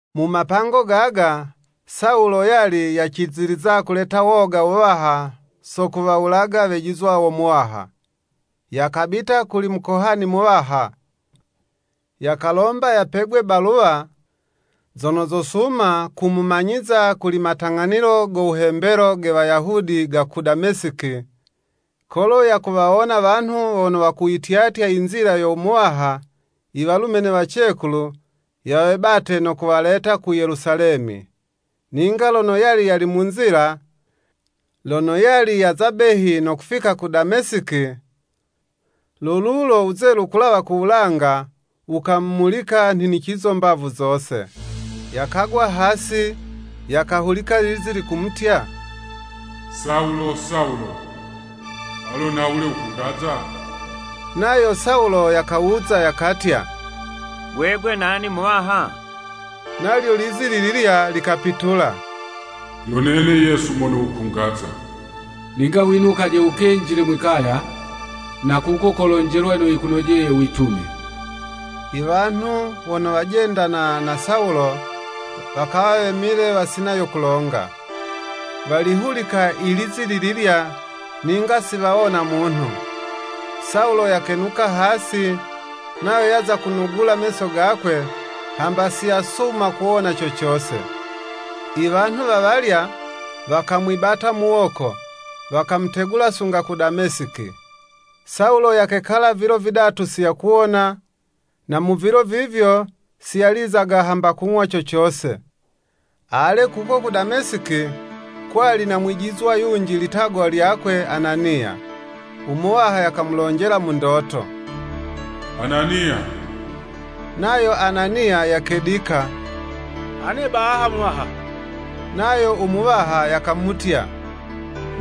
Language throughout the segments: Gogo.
Mu mapango gaga, Sawulo yali yaciziliza kuleta woga wuwaha so kuwawulaga wejizwa wo Muwaha. Yakabita kuli Mukohani muwaha, yakalomba yapegwe baluwa, zono zosuma kumumanyiza kuli matang'anilo go wuhembelo ge Wayahudi ga ku Damesiki, kolo yakuwawona wanhu wono wakuyityatya i Nzila yo Muwaha i walume ne wacekulu, yawebate no kuwaleta ku Yelusalemi. Ninga lono yali yali mu nzila, lono yali yaza behi no kufika ku Damesiki, lo lulo wuzelu kulawa ku wulanga, wukamumulika nhinicizo mbavu zose. Yakagwa hasi, yakahulika lizi likumutya, “Sawulo, Sawulo, alo nhawule wukungaza?” Nayo Sawulo yakawuza, yakatya “Gwegwe nani Muwaha?” Nalyo lizi lililya likapitula, “Yo nene Yesu mono wukungaza. Ninga winukaje wukenjile mwi'kaya, na kuko kolonjelwa yono yikunojeye witume.” Iwanhu wono wajendana na Sawulo, wakawa wemile wasina yo kulonga, walihulika ilizi lililya, ninga siwawona munhu. Sawulo yakenuka hasi, nayo yaza kunugula meso gakwe, hamba si yasuma kuwona co cose. Iwanhu wawalya, wakamwibata muwoko, wakamutegula sunga ku Damesiki. Sawulo yakekala vilo vidatu si yakuwona, na mu vilo vivyo si yalizaga hamba kung'wa co cose. Ale, kuko ku Damesiki, kwali na mwijizwa yunji, litagwa lyakwe Ananiya. U Muwaha yakamulonjela mu ndoto, “Ananiya!” Nayo Ananiya yakedika, “Ane baha Muwaha.” Nayo u Muwaha yakamutya,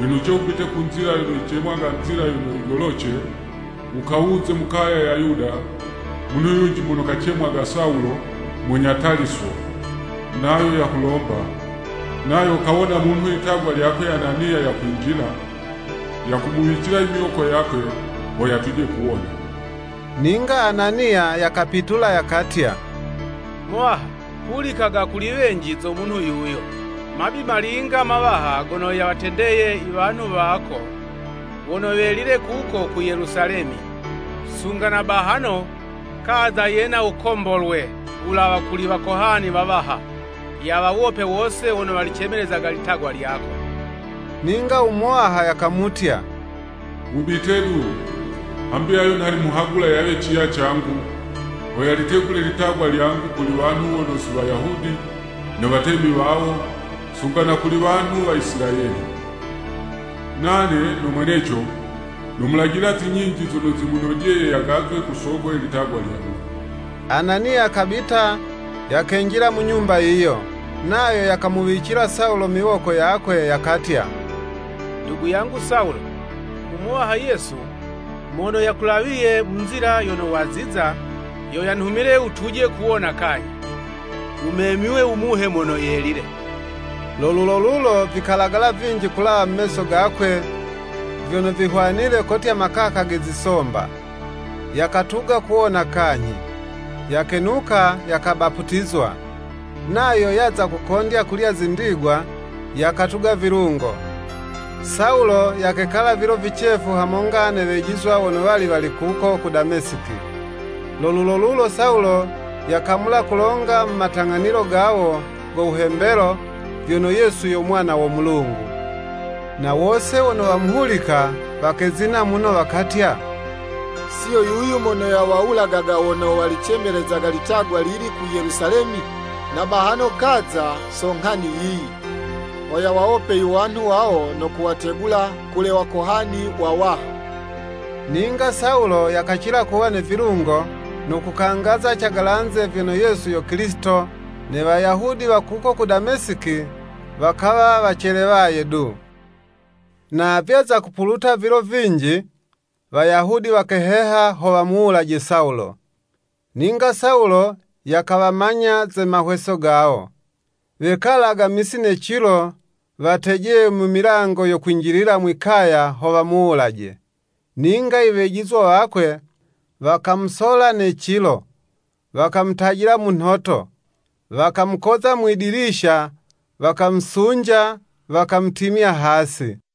“Winuce wubite ku nzila yono yicemwaga nzila yono yigoloce, wukawuze mu kaya ya Yuda, munhu yunji mono kacemwaga Sawulo, munya Taliso, nayo yakulomba, nayo kawona munhu litagwa lyakwe Ananiya yakwinjila, yakumuwicila imiwoko yakwe, ho yatuje kuwona.” Ninga Ananiya yakapitula yakatya, “Muwaha, hulikaga kuli wenji zo munhu yuyo, mabi malinga mawaha gono yawatendeye i wanhu wako wono welile kuko ku Yelusalemi. Sunga na bahano, kaza yena no wukombolwe wulawa kuli Wakohani wawaha, yawawope wose wono walicemelezaga litagwa lyako.” Ninga u Muwaha yakamutya, “Wubite du, hambi ayo, nha nimuhagula yawe ciya cangu, ho yalitegule litagwa lyangu kuli wanhu wono si Wayahudi, ne watemi wawo, sunga na kuli wanhu wa Isilayeli. Nane no mweneco, nomulajila zi nyinji zono zimunojeye yagazwe ku soko ye litagwa lyangu.” Ananiya yakabita, yakenjila mu nyumba yiyo. Nayo yakamuwicila Sawulo miwoko yakwe, yakatya “Ndugu yangu Sawulo, u Muwaha Yesu, mono yakulawiye mu nzila yono waziza, yo yanhumile wutuje kuwona kanyhi, wumemywe u Muhe Mono Yelile.” Lo lulo lulo, vikalagala vinji kulawa mu meso gakwe vyono vihwanile kotya makaka ge zisomba, yakatuga kuwona kanyhi. Yakenuka yakabaputizwa. Nayo yaza kukondya kulya zindigwa, yakatuga vilungo. Sawulo yakekala vilo vicefu hamonga ne wejizwa wono wali wali kuko ku Damesiki. Lo lulo lulo Sawulo yakamula kulonga mu matang'anilo gawo go wuhembelo, vyono Yesu yo Mwana wo Mulungu. Na wose wono wamuhulika, wakezina muno, wakatya, “Siyo yuyu mono yawawulagaga wono walicemelezaga litagwa lili ku Yelusalemi? Na bahano kaza so nghani yiyi, ho yawawope iwanhu wawo no kuwategula kuli Wakohani wawaha!” Ninga Sawulo yakacila kuwa ne vilungo, no kukangaza cagalanze, vyono Yesu yo Kilisito, ne Wayahudi wa kuko ku Damesiki, wakawa wacelewaye du. Na vyaza kupuluta vilo vinji, Wayahudi wakeheha ho wamuwulaje Sawulo. Ninga Sawulo, yakawamanya ze maheho gawo. Wekalaga misi ne cilo, watejeye mu milango yo kwinjilila mwi'kaya ho wamuwulaje. Ninga i wejizwa wakwe wakamusola ne cilo, wakamutajila mu nhoto, wakamukoza mwidilisha wakamusunja, wakamutimya hasi.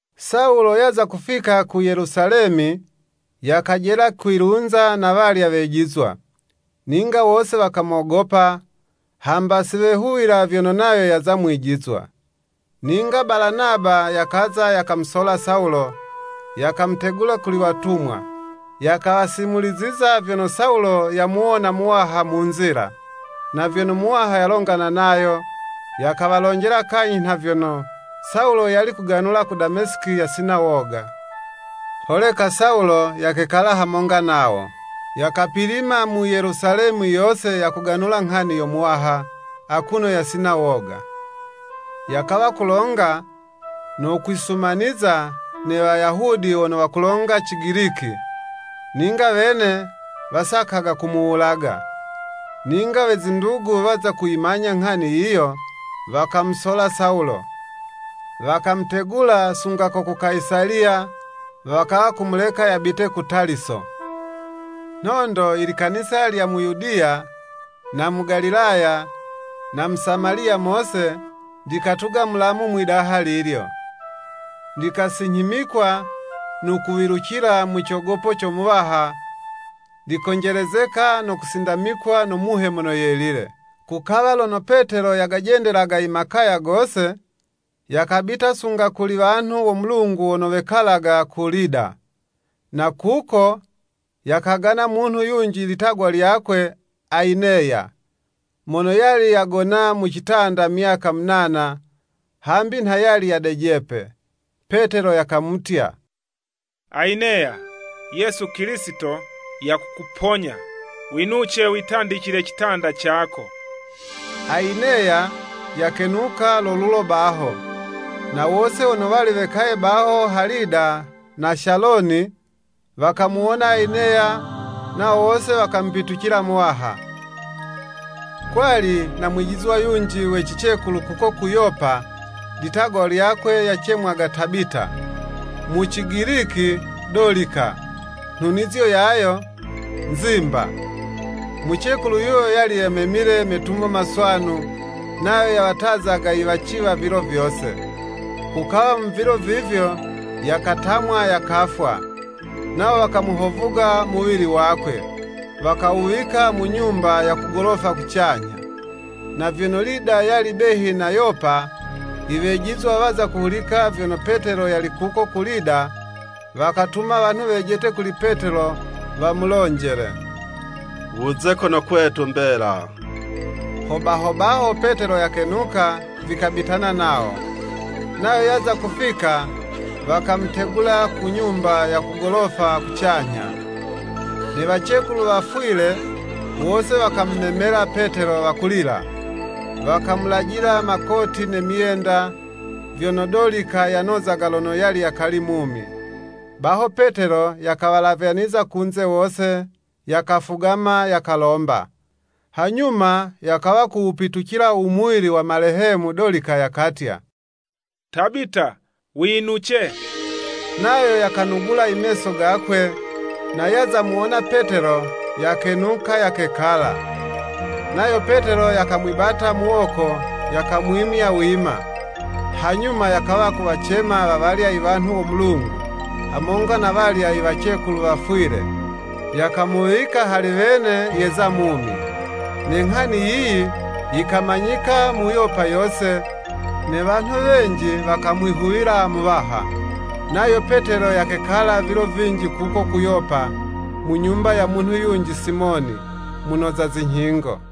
Sawulo yaza kufika ku Yelusalemi, yakajela kwilunza na walya wejizwa. Ninga wose wakamogopa, hamba siwehuwila vyono nayo yawa mwijizwa. Ninga Balanaba yakaza yakamusola Sawulo, yakamutegula kuli watumwa, yakawasimuliziza vyono Sawulo yamuwona Muwaha mu nzila, na vyono Muwaha yalongana nayo, yakawalonjela kanyhi nha vyono, Sawulo yali kuganula ku Damesiki yasina woga. Holeka Sawulo yakekala hamonga nawo. Yakapilima mu Yelusalemi yose yakuganula nghani yo Muwaha, akuno yasina woga. Yakawa kulonga, no kwisumaniza ne Wayahudi wono wakulonga ci giliki, ninga wene wasakaga kumuwulaga. Ninga we zindugu waza kuyimanya nghani yiyo, wakamusola Sawulo, wakamutegula sunga ko ku Kayisaliya, wakawa kumuleka yabite ku Taliso. Nhondo ilikanisa lya mu Yudiya, na mu Galilaya, na mu Samaliya mose, likatuga mulamu mwidaha lilyo. Likasinyhimikwa no kuwilucila mu cogopo co Muwaha, likonjelezeka no kusindamikwa no Muhe Mono Yelile. Kukawa lono Petelo yagajendelaga i makaya gose, yakabita sunga kuli wanhu wo Mulungu wono wekalaga ku Lida. Na kuko yakagana munhu yunji litagwa lyakwe Ayineya, mono yali yagona mu citanda myaka munana, hambi nha yali yadejepe. Petelo yakamutya “Ayineya, Yesu Kilisito yakukuponya. Winuce witandicile citanda cako.” Ayineya yakenuka lo lulo baho. Na wose wono wali wekaye baho ha Lida na Shaloni, wakamuwona Ayineya, nawo wose wakamupitucila Muwaha. Kwali na mwijizwa yunji we cicekulu kuko ku Yopa, litagwa lyakwe yacemwaga Tabita, mu Cigiliki Dolika, nhunizo yayo “Nzimba.” Mucekulu yuyo yali yamemile metumo maswanu, nayo yawatazaga iwaciwa vilo vyose. Kukawa mu vilo vivyo, yakatamwa, yakafwa. Nawo wakawuhovuga muwili wakwe, wakawuwika ku nyumba ya ku golofa kucanyha. Na vyono Lida yali behi na Yopa, iwejizwa waza kuhulika vyono Petelo yali kuko ku Lida, wakatuma wanhu wejete kuli Petelo wamulonjele, “Wuze kono kwetu mbela.” Hobaho baho Petelo yakenuka, vikabitana nawo. Nayo yaza kufika, wakamutegula ku nyumba ya ku golofa kucanyha. Ne wacekulu wafwile, wose wakamumemelela Petelo, wakulila, wakamulajila makoti ne myenda, vyono Dolika yanozaga lono yali yakali mumi. Baho Petelo yakawalavyaniza kunze wose, yakafugama, yakalomba. Hanyuma yakawa kuwupitucila u muwili wa malehemu Dolika, yakatya, “Tabita winuce.” Nayo yakanugula imeso gakwe, na yaza muwona Petelo, yakenuka yakekala. Nayo Petelo yakamwibata muwoko yakamwimya wima, hanyuma yakawa kuwacema wawalya iwanhu wo Mulungu, hamonga na walya iwacekulu wafwile, yakamuwika hali wene yeza mumi. Ne nghani yiyi yikamanyika mu Yopa yose, ne wanhu wenji wakamwihuwila Muwaha. Nayo Petelo yakekala vilo vinji kuko ku Yopa, mu nyumba ya munhu yunji Simoni, munoza zinyhingo.